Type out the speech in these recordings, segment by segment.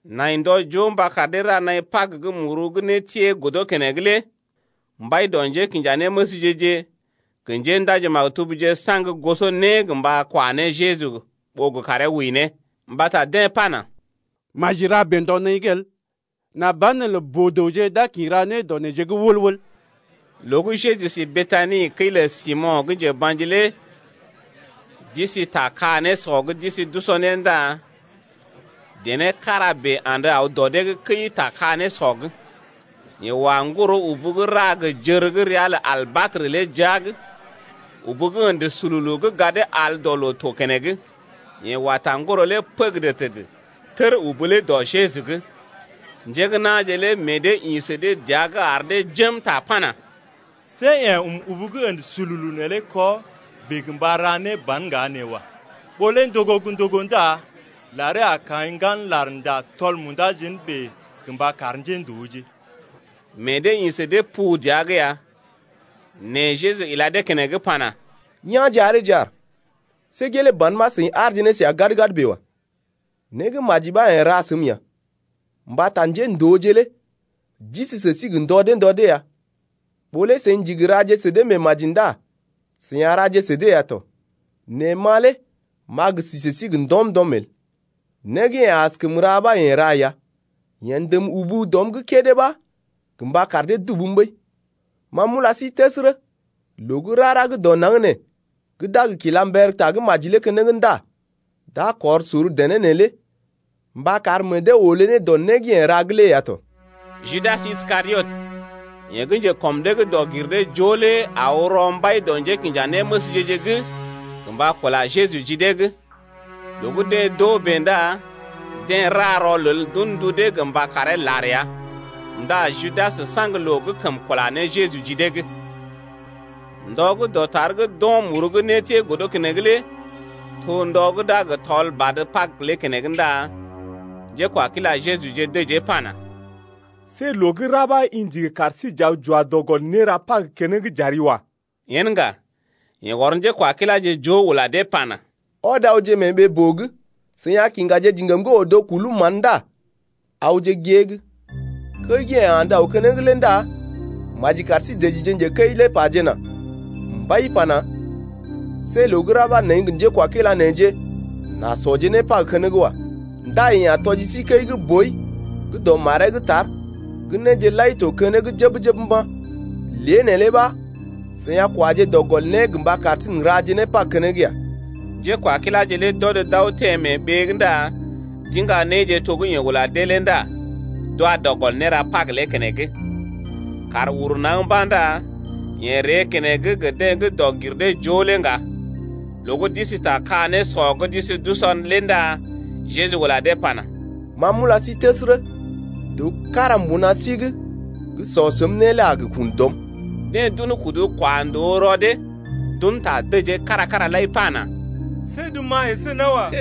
Nai ndɔ joo mba kar dee ra naḭ Pag gə́ muru gə́ nétiee godo keneŋ lé. Mbai dɔ njékinjanéməsje-je gə njéndaji-maktubje saŋg goso né gə mba kwa ne Jeju ɓó gə karee wəi ne. Mbata deḛ pana: Maji ra bèe ndɔ naḭ’g el, nà banelə boo-dəwje d’a kḭ ra né dɔ neḛje’g wəl-wəl. Loo gə́ Jeju si Betani kəi lə Simo̰ gə́ njeba̰ji lé d’isi ta ka-nésɔ’g d’isi d’usɔ né ndá dené kára bèe andə aw dɔ dee’g kəi ta ka-nésɔ’g lé. Yeḛ wa ŋgoro-ubu gə́ ra gə jər gə́ ria lə albatrə lé jia’g, ubu gə́ ə̰də sululu gə́ gadee al dɔ loo to keneŋ, yeḛ wa ta ŋgoro lé pəgədə təd, tər ubu lé dɔ Jeju’g. Njé gə́ na̰je lé meḛ dee ḭ sə dee pu dəa’g ar dee jém ta pana: See yeḛ ɔm ubu gə́ ə̰də sululu neelé kɔ bèe gə mba ra ne ban ŋga nee wa. Ɓó lé ndogo gə́ ndogo ndá laree a kaḭ ŋgan larnda tɔl munda jén gə mba kar njéndooje. Meḛ dee ḭ sə dee pu dəa’g ya. Nɛ Jeju ila dee keneŋ pana: Yá̰je areeje aar. See gelee ban ɓa seḭ aarje ne səa gad-gad bèe wa. Né gə́ maji ɓa yeḛ ra səm ya, mbata njéndooje lé d’isi sə sí gə ndɔ dee ndɔ dee ya, ɓó lé seḭ ndigi raje sə dee meemaji ndá seḭ a raje sə dee ya tɔ, nɛ ma lé m’a gə si sə sí gə ndɔm-ndɔm el. Né gə́ yeḛ askəm ra ɓa yeḛ ra ya, yeḛ ndəm ubu dɔm’g kédé ɓa gə mba kar dee dubum ɓəi. Ma m’ula sí təsərə, loo gə́ rara gə́ dɔ naŋg nee gə́ d’a gə kila mber tagə́maji lé keneŋ ndá d’a kɔr sor dené neelé mba kar meḛ dee olé ne dɔ né gə́ yeḛ ra’g lé ya tɔ. Judas Iskariot, yeḛ gə́ njekɔm dee’g dɔg-gir-dee-joo lé aw rɔ mbai dɔ njékinjanéməsje-je’g gə mba kula Jeju ji dee’g. Loo gə́ deḛ d’oo bèe ndá deḛ ra rɔlel d’un ndu dee gə mba karee lar ya. Ndá Judas saŋg loo gə́ kəm kula ne Jeju ji dee’g. Ndɔ gə́ dɔtar gə́ d’o̰ muru gə́ nétiee godo keneŋ lé to ndɔ gə́ d’a gə tɔl badə Pag lé keneŋ ndá njékwakila Jejuje dəjee pana: See loo gə́ ra ɓa i ndigi kar sí j’aw j’wa dɔ gɔl néra Pag keneŋ j’ari wa. Yen ŋga, yeḛ ɔr njékwakiláje joo ula dee pana: Ɔd awje mee ɓee-boo’g, seḭ a kiŋgaje diŋgam gə́ odo kulum mán ndá awje gée’g. Kəi gə́ yeḛ andə aw keneŋ lé ndá maji kar sí dəjije njekəi lé pajena: Mbai pana: See loo gə́ ra ɓa neḛ gə njekwakila neḛje n’a sɔje né Pag keneŋ wa. Ndá yeḛ a tɔji sí kəi gə́ boi gə́ dɔ maree’g tar, gə néje lai to keneŋ jəb-jəb mba̰. Lée neelé ɓa seḭ a kwaje dɔ gɔl né gə mba kar sí n’raje ne Pag keneŋ ya. Njékwakiláje lé d’ɔd d’aw teḛ mee ɓee’g ndá d’iŋga néje to gə́ yeḛ ula dee lé ndá d’wa dɔ gɔl néra Pag lé keneŋ. Kàr uru naŋg mba̰ ndá yeḛ ree keneŋ gə deḛ gə́ dɔg-gir-dee-joo lé ŋga. Loo gə́ d’isi ta ka-nésɔ’g d’isi d’usɔ lé ndá Jeju ula dee pana: Ma m’ula sí təsərə, dəw kára mbuna sí’g gə́ sɔ səm né lé a gə kun dɔm. Deḛ d’un kudu kwa ndòo rɔ dee, d’un ta dəjee kára-kára lai pana: See’d ma əsé nawa.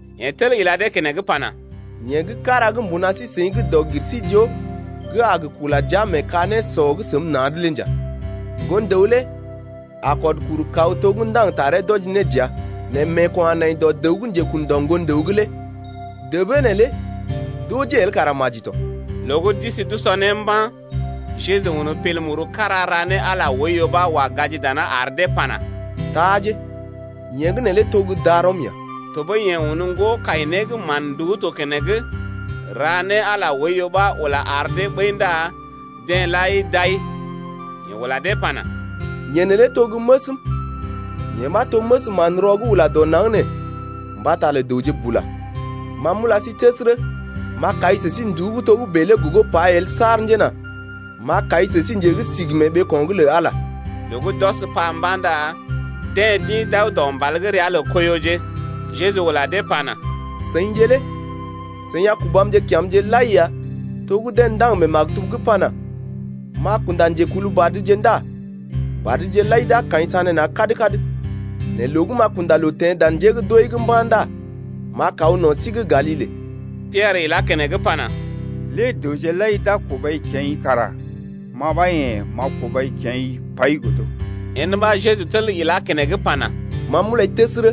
Yeḛ tel ila dee keneŋ pana: Yeḛ gə́ kára gə́ mbuna sí-seḭ gə́ dɔg-gir-sí-joo gə́ a gə kula jia mee ka-nésɔ’g səm na̰’d lé nja. Ŋgon-dəw lé kɔd kuru kaw to gə́ ndaŋg taree wɔji ne dəa. Nɛ meeko̰ a nai dɔ dəw gə́ njekun dɔ Ŋgon-dəw’g lé. Débee neelé d’ojee el kara maji tɔ. Loo gə́ d’isi d’usɔ né mba̰ Jeju un pil muru kára ra ne Ala oiyo ɓa wa gaji dana ar dee pana: Taaje, yeḛ gə́ neelé to gə́ darɔm ya. Tɔɓəi yeḛ un ŋgo-kai-né gə́ mán-nduú to keneŋ ra ne Ala oiyo ɓa ula ar dee ɓəi ndá deḛ lai d’ai. Yeḛ ula dee pana: Yee neelé to gə́ məsm, yee ɓa to məs manrɔ gə́ ula dɔ naŋg nee mbata lə dəwje bula. Ma m’ula sí təsərə, m’a kai sə sí nduú gə́ togə́bè lé gogo pai el saar njena m’a kai sə sí nje gə́ sigi mee ɓeeko̰’g lə Ala lé. Loo gə́ d’ɔs pa mba̰ ndá deḛ d’ḭ d’aw dɔ mbal gə́ ria lə Koiyoje. Jeju ula dee pana: Seḭje lé seḭ a kubamje kya̰’mje lai ya to gə́ deḛ ndaŋg mee maktub’g pana: M’a kunda njekulbadje ndá badje lai d’a kaḭ sanéna̰ kad-kad. Nɛ loo gə́ m’a kunda loo teḛ dan njé gə́ d’wəi’g mba̰ ndá m’a kaw no̰ sí’g Galile. Piɛrə ilá keneŋ pana: Lée dəwje lai d’a kubai kya̰’i kara ma ɓa yḛ̀ m’a kubai kya̰’i pai godo. Yen ɓa Jeju tel ilá keneŋ pana: Ma m’ulai təsərə,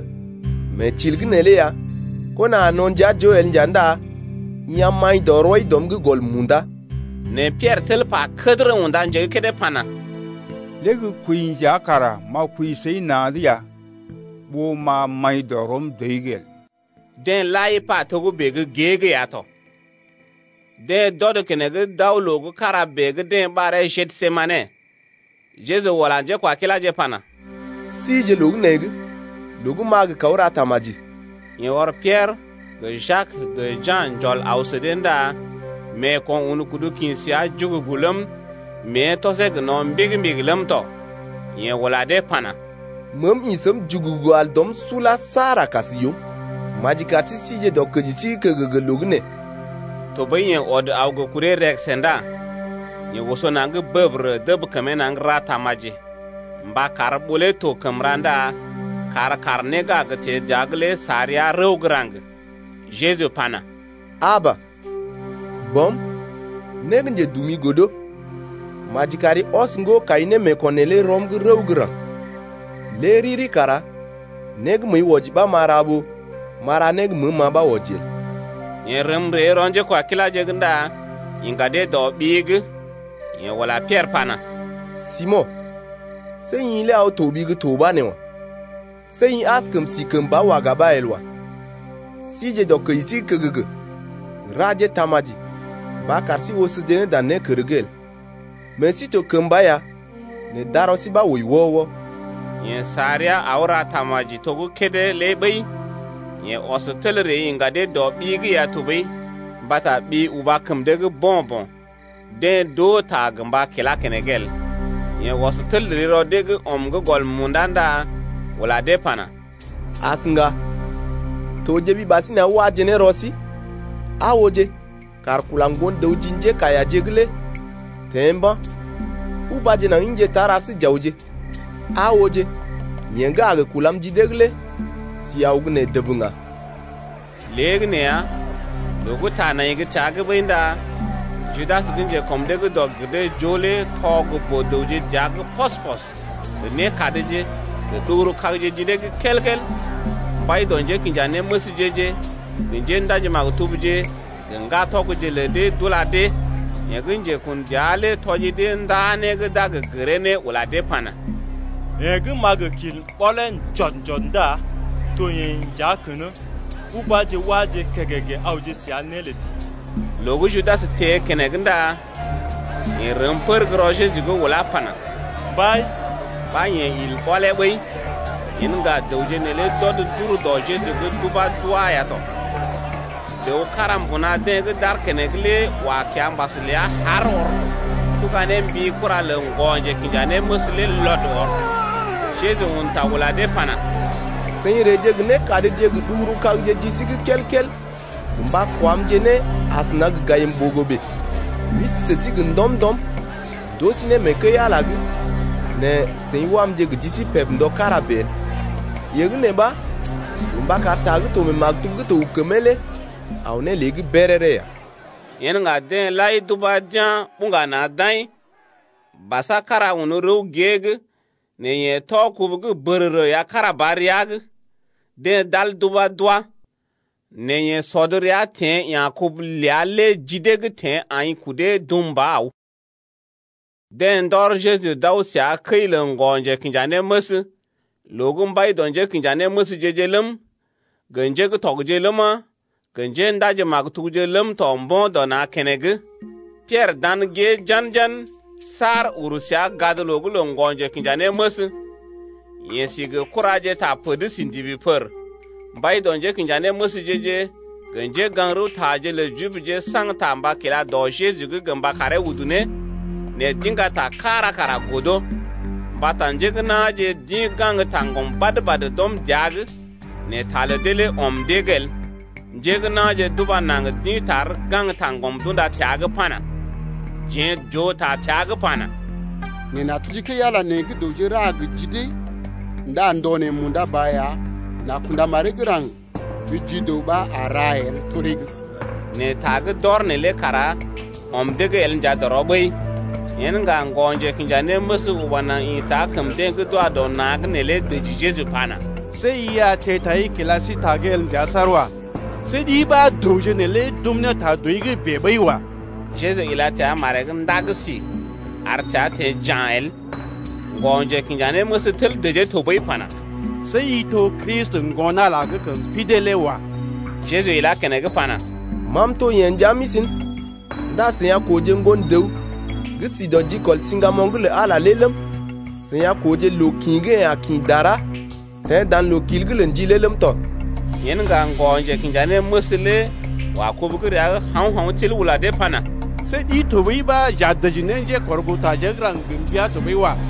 mee til’g neelé ya kona a no̰ ndia joo el ŋga ndá i a maḭ dɔ rɔi dɔm’g gɔl munda. Nɛ Piɛrə tel pa kədərə unda nje gə́ kédé pana: Lé gə́ kwəi nja kara m’a kwəi səi na̰’d ya, ɓó m’a maḭ dɔ rɔm dɔi’g el. Deḛ lai pa togə́bè gə́ gée’g ya tɔ. Deḛ d’ɔd keneŋ d’aw loo gə́ kára bèe gə́ deḛ ɓaree Gesemane. Jeju ula njékwakiláje pana: sije loo gə́ nee’g loo gə́ m’a gə kaw ra tamaji. Yeḛ ɔr Piɛrə gə Jak gə Ja̰ njɔl aw sə dee ndá meeko̰ un kudu kḭ səa jugugu ləm, mée tɔsee gə no̰ mbigi-mbigi ləm tɔ. Yeḛ ula dee pana: Meem ḭ səm jugugu al dɔm sula saar a kas yoom, maji kar sí sije dɔkəji sí’g kəgəgə loo gə́ nee. Tɔɓəi yeḛ ɔd aw gə kuree rəgəsə ndá yeḛ oso naŋg bəbərə dəb kəmee naŋg ra tamaji mba kar ɓó lé to kəm ra ndá kar kàr né gə́ a gə teḛ dəa’g lé sa rəa rəw gə́ raŋg. Jeju pana: Aba, Bɔm, né gə́ njedumi godo. Maji kari ɔs ŋgo-kai némeeko̰ neelé rɔm’g rəw gə́ raŋg. Lé riri kara né gə́ məəi wɔji ɓa m’a ra ɓó m’a ra né gə́ məəm ma ɓa wɔji el. Yeḛ rəm ree rɔ njékwakiláje’g ndá iŋga dee dɔ ɓi’g. Yeḛ ula Piɛrə pana: Simo̰, see i lé aw toɓi gə́ to ɓa nee wa! See i askəm si kəmba dɔkur-kàr kára el wa! Sije dɔ kəji sí’g kəgəgə raje tamaji mba kar sí osoje ne dan nékərje’g el. Meḛ sí to kəmba ya nɛ darɔ sí ɓa wəi wɔ-wɔ. Yeḛ sa rəa aw ra tamaji to gə́ kédé lé ɓəi. Yeḛ ɔs tel ree iŋga dee dɔ ɓi’g ya tɔɓəi, mbata ɓi uba kəm dee’g bo̰-bo̰. Deḛ d’oo ta gə mba kilá keneŋ el. Yeḛ ɔs tel ree rɔ dee’g ɔm’g gɔl munda ndá ula dee pana: As ŋga! Tojeɓi ɓasinè aw waje ne rɔ sí. Aa ooje, kàr kula Ŋgon-dəw ji njékaiyaje’g lé teḛ mba̰. Ubaje naŋg ḭje tar ar sí j’awje. Aa ooje, yeḛ gə́ a gə kulam ji dee’g lé si aw gə́ nee dəb ŋga. Léegəneeya, loo gə́ ta nai gə́ təa’g ɓəi ndá Judas gə́ njekɔm dee’g dɔg-gir-dee-joo lé tɔ gə boo-dəwje dəa’g pɔs-pɔs gə nékadje gə ɗuguru-kagje ji dee’g kel-kel, mbai dɔ njékinjanéməsje-je gə njéndaji-maktubje gə ŋgatɔgje lə dee ɓa d’ula dee. Yeḛ gə́ njekun dəa lé tɔji dee nda né gə́ d’a gə gəree ne ula dee pana: Yeḛ gə́ m’a gə kil ɓɔlee njɔd-njɔd ndá to yeḛ nja kən-ə, ubáje wáje kègègè awje səa né lə sí. Loo gə́ Judas teḛ keneŋ ndá yeḛ rəm pər gə́ rɔ Jeju’g ulá pana: Mbai! Ɓa yeḛ ɔd il ɓɔlee ɓəi. Yen ŋga dəwje neelé d’ɔd d’ur dɔ Jeju’g d’ubá d’wá ya tɔ. Dəw kára mbuna deḛ gə́ d’aar keneŋ lé wa kiambas lə haar ɔr, tuga ne mbi kura lə ŋgɔ-njekinjanéməs lé lɔd ɔr. Jeju un ta ula dee pana: Seḭ reeje gə nékadje gə ɗuguru-kagje ji sí’g kel-kel gə mba kwamje ne asəna gə gayim-ɓogo bèe. M’isi sə sí gə ndɔm-ndɔm m’ndoo sí né mee kəi-Ala’g nɛ seḭ wamje gə ji sí peb ndɔ kára bèe el. Yee gə́ nee ɓa to mba kar ta gə́ to mee maktub gə́ to gə kəmee lé aw ne lée’g béréré ya. Yen ŋga deḛ lai d’ubá d’yá̰ buŋga na̰ d’aḭ. Basa kára un rəw gée’g nɛ yeḛ tɔ kubu gə́ bərərə ya kára ba rəa’g. Deḛ d’al d’ubá d’wá, nɛ yeḛ sɔd rəa teḛ ya̰ kubu ləa lé ji dee’g teḛ aḭ kudee dum ba aw. Deḛ ndɔr Jeju d’aw səa kəi lə ŋgɔ-njekinjanéməs, loo gə́ mbai dɔ njékinjanéməsje-je ləm, gə njé gə́ tɔgje ləma, gə njéndaji-maktubje ləm tɔ mbo̰ dɔ na̰ keneŋ. Piɛrə dan gée jan-jan saar uru səa gadloo’g lə ŋgɔ-njekinjanéməs. Yeḛ si gə kuraje ta pər’d si ndibi pər. Mbai dɔ njékinjanéməsje-je gə njégaŋ-rəwtaje lə Jibje saŋg ta mba kila dɔ Jeju’g gə mba karee udu ne, nɛ d’iŋga ta kára kara el. Mbata njé gə́ na̰je d’ḭ gaŋg taŋgɔm badə-badə d’ɔm dəa’g nɛ ta lə dee ɔm dee’g el. Njé na̰je d’uba naŋg d’ḭ tar gaŋg taŋgɔm d’unda təa’g pana: Jeḛ j’oo ta təa’g pana: Neḛ n’a tuji kəi-Ala nee gə́ dəwje ra gə ji dee ndá ndɔ neḛ munda ba ya n’a kunda maree gə́ raŋg gə́ ji dəw ɓa a ra el toree’g. Nɛ ta gə́ d’ɔr neelé kara ɔm dee’g el nja dɔrɔ ɓəi. Yen ŋga ŋgɔ-njekinjanéməs uba naŋg ḭta kəm deḛ gə́ d’wa dɔ na̰’g neelé dəji Jeju pana: See i a teḛ tai kila sí ta’g el nja saar wa. See ɗi ɓa dəwje neelé d’ɔm ne ta dɔi’g bèe ɓəi wa. Jeju ila təa maree’g ndaŋg si, ar təa teḛ ja̰ el. Ŋgɔ-njekinjanéməs tel dəjee tɔɓəi pana: See i to Kristi, Ŋgon-Ala gə́ kəm pidee lé wa. Jeju ilá keneŋ pana: Ma m’to yeḛ nja m’isi’n. Ndá seḭ a kooje Ŋgon-dəw gə́ si dɔ jikɔl siŋgamoŋ lə Ala lé ləm, seḭ a kooje loo kḭ gə́ yeḛ a kḭ dara teḛ dan loo-kil’g lə ndi lé ləm tɔ. Yen ŋga ŋgɔ-njekinjanéməs lé wa kubu gə́ rəa’g hao̰-hao̰ til ula dee pana: See ɗi tɔɓəi ɓa j’a dəji ne njékɔrgootareeje gə́ raŋg gə mbəa tɔɓəi wa.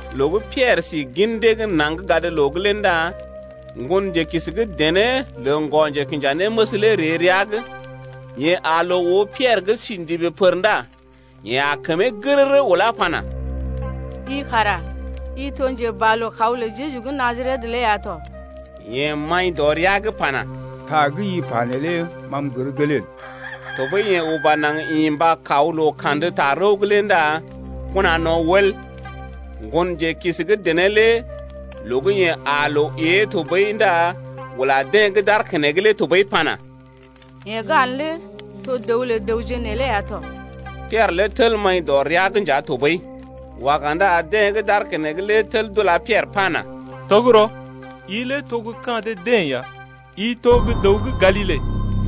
Loo gə́ Piɛrə si gin dee’g naŋg gadloo’g lé ndá ŋgonjelookisi gə́ dené lə ŋgɔ-njekinjanéməs lé ree rəa’g. Yeḛ aa loo oo Piɛrə gə́ si ndibi pər ndá yeḛ aa kəmee gərərə ulá pana: I kara i to gə́ njeboalookaw lə Jeju gə́ Najaret lé ya tɔ. Yeḛ maḭ dɔ rəa’g pana: Ta gə́ i pa neelé ma m’gər gelee el. Tɔɓəi yeḛ uba naŋg ḭ mba kaw loo-Kandə-tarəw’g lé ndá kona no̰ wəl. Ŋgonjelookisi gə́ dené lé loo gə́ yeḛ aa loo ée tɔɓəi ndá ula deḛ gə́ d’aar keneŋ lé tɔɓəi pana: Yeḛ gə́ aa’n lé to dəw lə dəwje neelé ya tɔ. Piɛrə lé tel maḭ dɔ rəa’g nja tɔɓəi. Waga ndá deḛ gə́ d’aar keneŋ lé tel d’ula Piɛrə pana: Tɔgərɔ, i lé to gə́ ka̰ dee-deḛ ya mbata i to gə́ dəw gə́ Galile.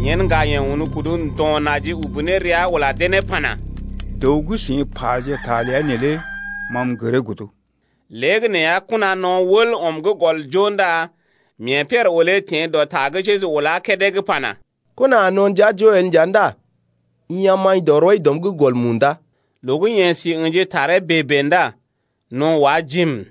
Yen ŋga yeḛ un kudu ndo̰ naji ubu ne rəa ula dee ne pana: Dəw gə́ seḭ paje ta ləa neelé ma m’gəree godo. Léegəneeya kona no̰ wəl ɔm gə́ gɔl joo ndá mee Piɛrə olé teḛ dɔ ta gə́ Jeju ulá kédé’g pana: Kona a na̰ ndia joo el nja ndá i a maḭ dɔ rɔi dɔm’g gɔl munda. Loo gə́ yeḛ si ə̰ji taree bèe-bèe ndá no̰ wá jiim.